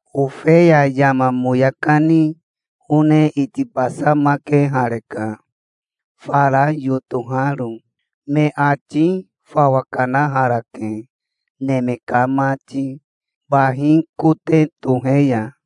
Ofeya yama moya kani one itibasamakehareka, fara yotoharo. Me ati fawa kanaharake, neme ka mati, bahi kote tohe ya.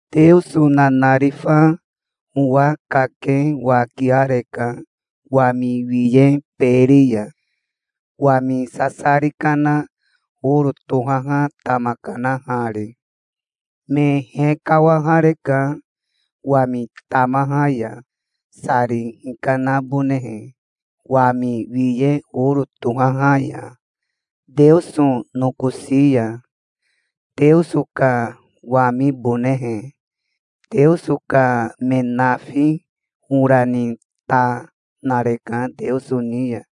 Teoso nanarifa owa kake wakiareka wami wiye beri ya, wami sasari kana oro tohaha tama kanahari. Me hekawahareka wami tamaha ya, sari hinahabonehe wami wiye oro tohaha ya, Teoso nokosi ya, Teoso ka wamibonehe. Teoso ka me nafi ora ni ta, nareka Teoso ni ya.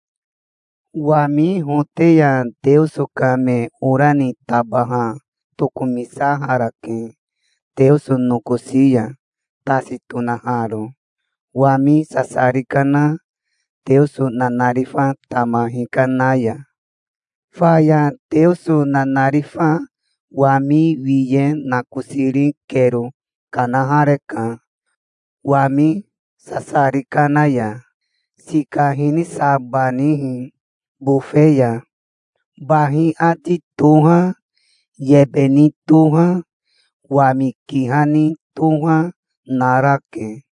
Wami hote ya Teoso ka me ora ni tabaha tokomisaharake Teoso nokosi ya, tasi tonaharo wami sasari kana Teoso nanarifa tama hikana ya. Faya Teoso nanarifa wami wiye nakosiri kero kanahareka wami sasari kana ya, sika hinisabanihi bofe ya. Bahi ati toha, yebe ni toha, wami kiha ni toha, narake.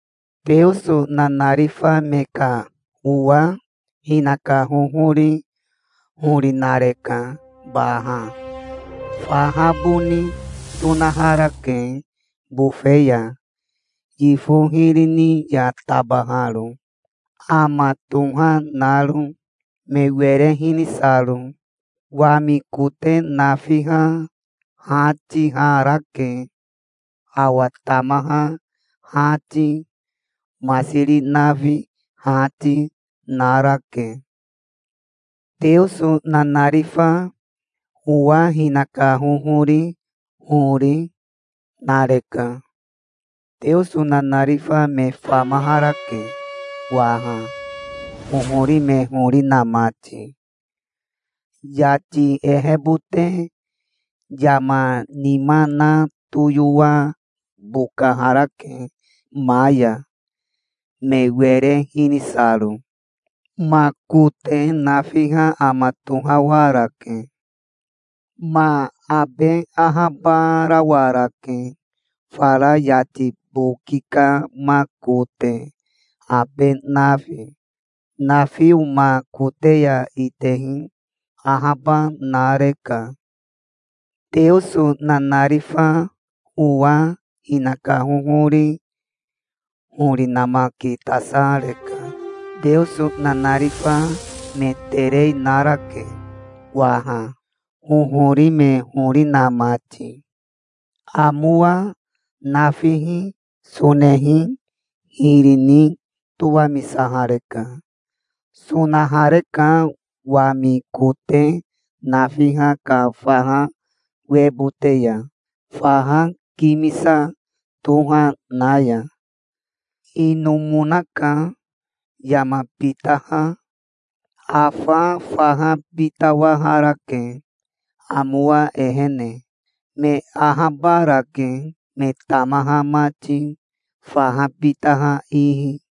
Teoso nanarifa me ka owa hinaka hohori hori nareka baha. Faha boni sonaharake bofe ya, yifo hiri ni ya tabaharo, ama toha naro, me were hinisaro. Wami kote nafiha hatiharake. Awa tamaha hati, masiri nafi hati, narake. Teoso nanarifa owa hinaka hohori hori, nareka. Teoso nanarifa me famaharake waha, hohori me hori na mati. Yati ehebote yama nima na toyowa bokaharake ma ya, me were hinisaro. Ma kote nafiha ama tohawarake. Ma abe ahabarawarake fara yati boki ka ma kote abe nafi. Nafio ma kote ya itehi ahaba nareka. Teoso nanarifa owa hinaka hohori hori namakitasareka. Teoso nanarifa me terei narake waha, hohori me hori na mati. Amowa nafihi sonehi hiri ni towamisahareka. Sonahareka wami kote nafiha ka faha webote ya, faha kimisa toha na ya. Inomonaka Yama Bitaha. Afa faha bitawaharake, amowa ehene. Me ahabarake, me tamaha mati, faha bitaha ihi.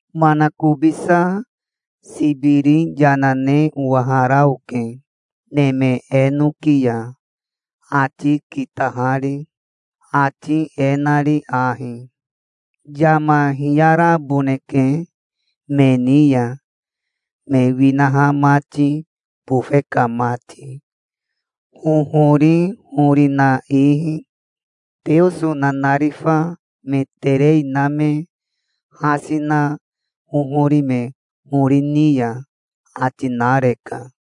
Manakobisa sibiri yana ne owahara oke neme enoki ya, ati kitahari, ati e nari ahi: "Yama hiyaraboneke me ni ya, me winaha mati, bofe ka mati, hohori hori na ihi, Teoso nanarifa me terei na me hasi na hohori me hori ni ya", ati nareka.